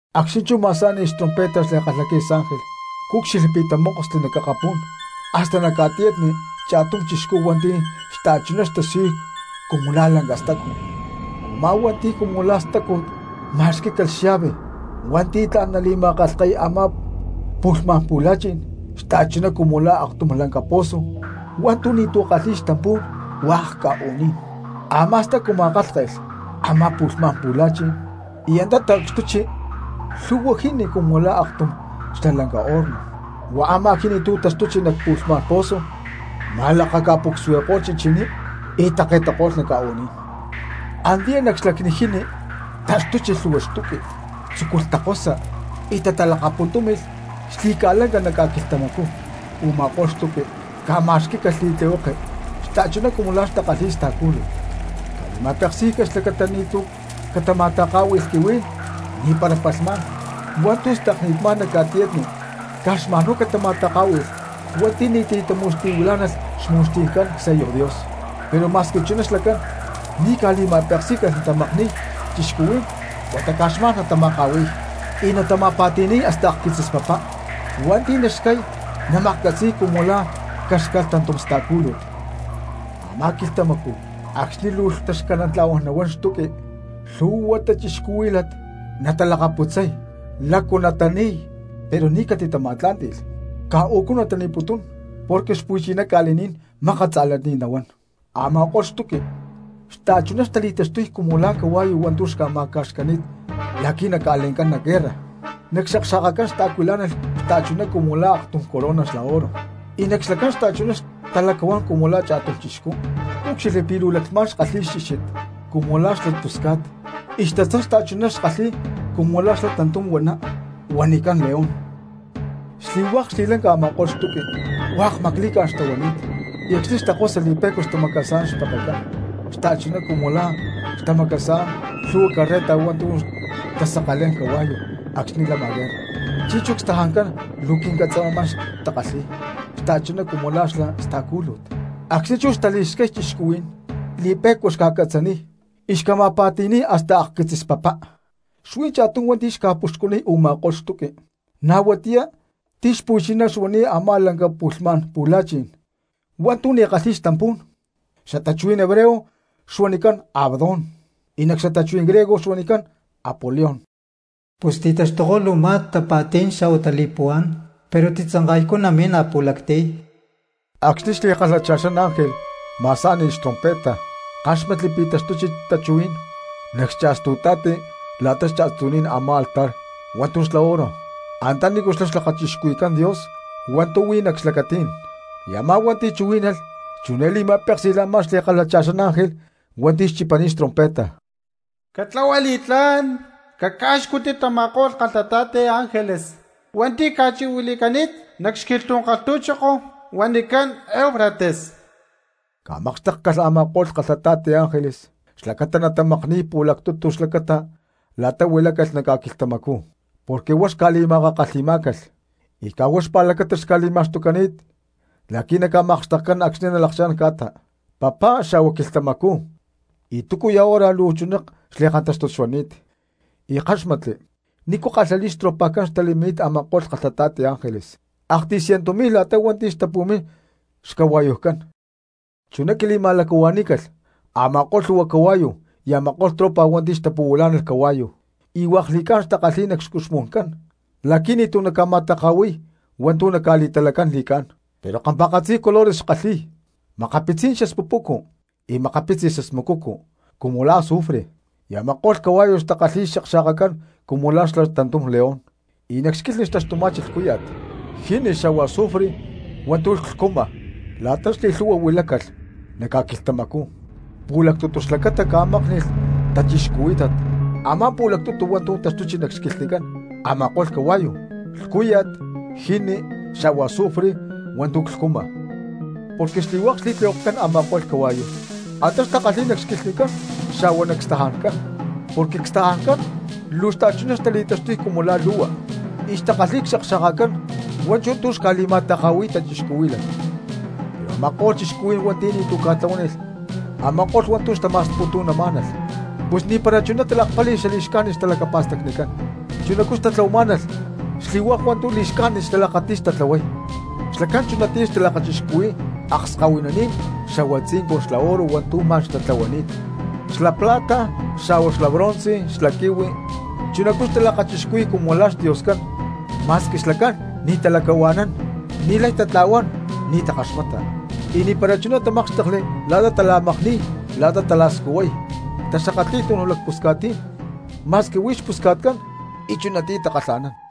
Acxni̠ chú ma̠sá̠ni̠lh xtrompeta xli̠kalhaquitzis ángel, cúcxilhli pi̠ tamókosli nac akapú̠n hasta nac ca̠tiyatni cha̠tum chixcú hua̠nti̠ xta̠chuná xtasiyuy cumu la̠ lanca stacu. Umá hua̠nti̠ cumu la̠ stacu ma̠xquí̠calh xallave hua̠ntu̠ tla̠n nali̠ma̠kalhke̠y a̠má pu̠lhmá̠n pu̠la̠chi̠n xta̠chuná cumu la̠ aktum lanca poso hua̠ntu̠ ni̠tu̠ kalhi̠y xtampú̠n hua̠k ca̠u̠ní̠n. Amá stacu ma̠kálhke̠lh a̠má pu̠lhmá̠n pu̠la̠chi̠n y antá ta̠cxtuchi lhu̠hua jini cumu la̠ aktum xla lanca horno, huá a̠má jini tu̠ tacutchi nac pu̠lhmá̠n poso ma̠lakaca̠pucsuani̠ko̠lh chichiní y take̠tako̠lh nac ca̠u̠ní̠n. Antiyá nac xlacni jini taxtuchi lhu̠hua xtuqui, tzúculh takosa y talakapuntúmi̠lh xli̠ca̠lanca nac ca̠quilhtamacú, u̠ma̠ko̠lh xtuqui ca̠ma̠xquí̠calh li̠tlihueke xta̠chuná cumu la̠ takalhi̠y sta̠cúlut. Ca̠li̠ma̠peksí̠calh xlacata pí ni̠tu̠ catama̠taká̠hui̠lh quihuí̠n, ni̠para li̠cúxtut hua̠ntu̠ stakni̠t má nac ca̠tiyatni, caj xma̠n huá catama̠taká̠hui̠lh hua̠nti̠ ni̠tu̠ tamu̠xti̠huilá̠nalh cxmu̠xti̠ncán csello Dios. Pero ma̠squi chuná xlacán ni̠ ca̠li̠ma̠peksí̠calh natamakni̠y cristianos, huata caj xma̠n natama̠ka̠hui̠y, y natama̠pa̠ti̠ni̠y hasta akquitzis papá, y wa̠nti̠ naxcáy namaklhcatzí̠y cumu la̠ caxcálh tantum sta̠cúlut. Amá quilhtamacú acxni̠ luu taxcanantla̠huán nahuán xtuqui lhu̠hua cristianos natalacputzay lácu natani̠y, pero ni̠ catitama̠tlá̠nti̠lh, caj u̠cú natani̠putún pero xpu̠chiná ca̠li̠ní̠n mákat tza̠lani̠t nahuán. Ama̠ko̠lh xtuqui xta̠chuná xtali̠taxtuy cumu la̠ cahua̠yu hua̠ntu̠ ca̠ma̠ca̠xcani̠t la̠qui̠ naca̠le̠ncán nac guerra; nac xakxa̠kacán xtaacuilá̠nalh xta̠chuná cumu la̠ aktum corona xla oro, y nac xlacán xta̠chuná xtalacahuán cumu la̠ cha̠tum cristiano. Cúcxilhli pi̠ luu laclhmá̠n xkalhi̠y xchíxit cumu la̠ xla pusca̠t, y xtatzán xta̠chuná xkalhi̠y cumu la̠ xla tantum huaná huanicán león. Xli̠hua̠k xli̠lanca a̠ma̠ko̠lh xtuqui hua̠k macli̠cá̠n xtahuani̠t, y acxni̠ xtakosa li̠pe̠cua xmacasa̠nán xpekecán xta̠chuná cumu la̠ tamacasa̠nán lhu̠hua carreta hua̠ntu̠ talhtanca̠lé̠n cahua̠yu acxni̠ lama guerra. Chi̠nchú cstajancán luu quincatzamaman xtakalhi̠y xta̠chuná cumu la̠ xla sta̠lúcut, acxni̠ chú xtali̠xcay cristianos li̠pe̠cua xca̠catzaniy y xca̠ma̠pa̠ti̠ni̠y hasta akquitzis papá. Xuí cha̠tum hua̠nti̠ xca̠puxcuniy u̠ma̠ko̠lh xtuqui na̠ huatiyá ti̠ xpu̠chiná xuani̠t a̠má lanca pu̠lhmá̠n pu̠la̠chi̠n hua̠ntu̠ ni̠ kalhi̠y xtampú̠n, cxtachuhuí̠n hebreo xuanicán Abadón y nac xatachuhuí̠n griego xuanicán Apolión. Pus ti̠taxtuko̠lh u̠má tapa̠tí̠n xa̠hua tali̠puhuá̠n, pero titzanka̠ycú natimín a̠pu̠lactiy. Acxni̠ xli̠kalhacha̠xán ángel ma̠sá̠ni̠lh xtrompeta, ckáxmatli pi̠ taxtuchi tachuhuí̠n nac cha̠stu̠ta̠ti la̠ta xcha̠stu̠ní̠n a̠má altar hua̠ntu̠ xla oro antanícu xlá lakachixcuhui̠cán Dios hua̠ntu̠ huí nac xlacatí̠n. Y a̠má hua̠nti̠ chuhuí̠nalh chiné li̠ma̠péksi̠lh a̠má xli̠kalhacha̠xán ángel hua̠nti̠ xchipani̠t xtrompeta: —Catlahua li̠tlá̠n cacá̠xcutti tama̠ko̠lh kalhata̠ti ángeles hua̠nti̠ ca̠chi̠huili̠cani̠t nac xquilhtú̠n kalhtu̠choko huanicán Eufrates. Ca̠makxtékcalh a̠ma̠ko̠lh kalhata̠ti ángeles xlacata natamakni̠y pu̠lactutu xlacata la̠ta huilácalh nac ca̠quilhtamacú, porque huá xca̠li̠makakalhi̠má̠calh, y caj huá xpa̠lacata xca̠li̠ma̠xtucani̠t la̠qui̠ naca̠makxtekcán acxni̠ nalakchá̠n ca̠ta, papá xa̠hua quilhtamacú y túcuya̠ hora luu chuná xli̠kantáxtut xuani̠t. Y ckáxmatli nícu kalhali̠t xtropajcán xtali̠mín a̠ma̠ko̠lh kalhata̠ti ángeles, aktiy ciento mi̠lh la̠ta hua̠nti̠ xtapu̠mín xcahua̠yujcán. Chuná quili̠ma̠lacahua̠ní̠calh a̠ma̠ko̠lh lhu̠hua cahua̠yu y a̠ma̠ko̠lh tropa hua̠nti̠ xtapu̠huilá̠nalh cahua̠yu, hua̠k li̠cá̠n xtakalhi̠y nac xcuxmu̠ncán la̠qui̠ ni̠tu̠ naca̠ma̠takahui̠y hua̠ntu̠ naca̠li̠talacán li̠cá̠n, pero kampa̠katzi colores xkalhi̠y, makapitzi spupucu y makapitzi smucucu cumu la̠ azufre. Y a̠ma̠ko̠lh cahua̠yu xtakalhi̠y xakxa̠kacán cumu la̠ xla tantum león, y nac xquilhni xtaxtuma̠chi lhcúya̠t, jini xa̠hua azufre hua̠ntu̠ clhcuma. La̠ta xli̠lhu̠hua huilácalh nac ca̠quilhtamacú pu̠lactutu xlacata ca̠mákni̠lh cristianos a̠má pu̠lactutu hua̠ntu̠ taxtuchi nac xquilhnicán a̠ma̠ko̠lh cahua̠yu: lhcúya̠t, jini, xa̠hua azufre hua̠ntu̠ clhcuma. Porque xli̠hua̠k xli̠tlihuekecán a̠ma̠ko̠lh cahua̠yu antá xtakalhi̠y nac xquilhnicán xa̠hua nac cstajancán; porque cstajancán luu xta̠chuná xtali̠taxtuy cumu la̠ lu̠hua, y xtakalhi̠y xakxa̠kacán hua̠nchú tu̠ xca̠li̠ma̠taka̠hui̠y cristianos. Pero a̠ma̠ko̠lh cristianos hua̠nti̠ ni̠tu̠ ca̠tlahuánilh a̠ma̠ko̠lh hua̠ntu̠ xtama̠sputu̠namá̠nalh, pus ni̠para chuná talakpáli̠lh xali̠xcájnit xtalacapa̠stacnicán, chunacú xtatlahuamá̠nalh xli̠hua̠k hua̠ntu̠ li̠xcájnit xtalakati̠y tatlahuay, xlacán chunatiyá xtalakachixcuhui̠y akskahuininí̠n xa̠hua tzincun xla oro hua̠ntu̠ ma̠n xtatlahuani̠t, xla plata, xa̠hua xla bronce y xla quihui, chunacú xtalakachixcuhui̠y cumu la̠ xdioscán ma̠squi xlacán ni̠ talacahua̠nán y ni̠lay tatla̠huán, ni̠ takaxmata. Y ni̠para chuná tamákxtekli la̠ta tala̠makni̠y, la̠ta tala̠scuhuay, taxakatli̠y tunuj lacpusca̠tní̠n ma̠squi huí xpusca̠tcán y chunatiyá takalha̠nán.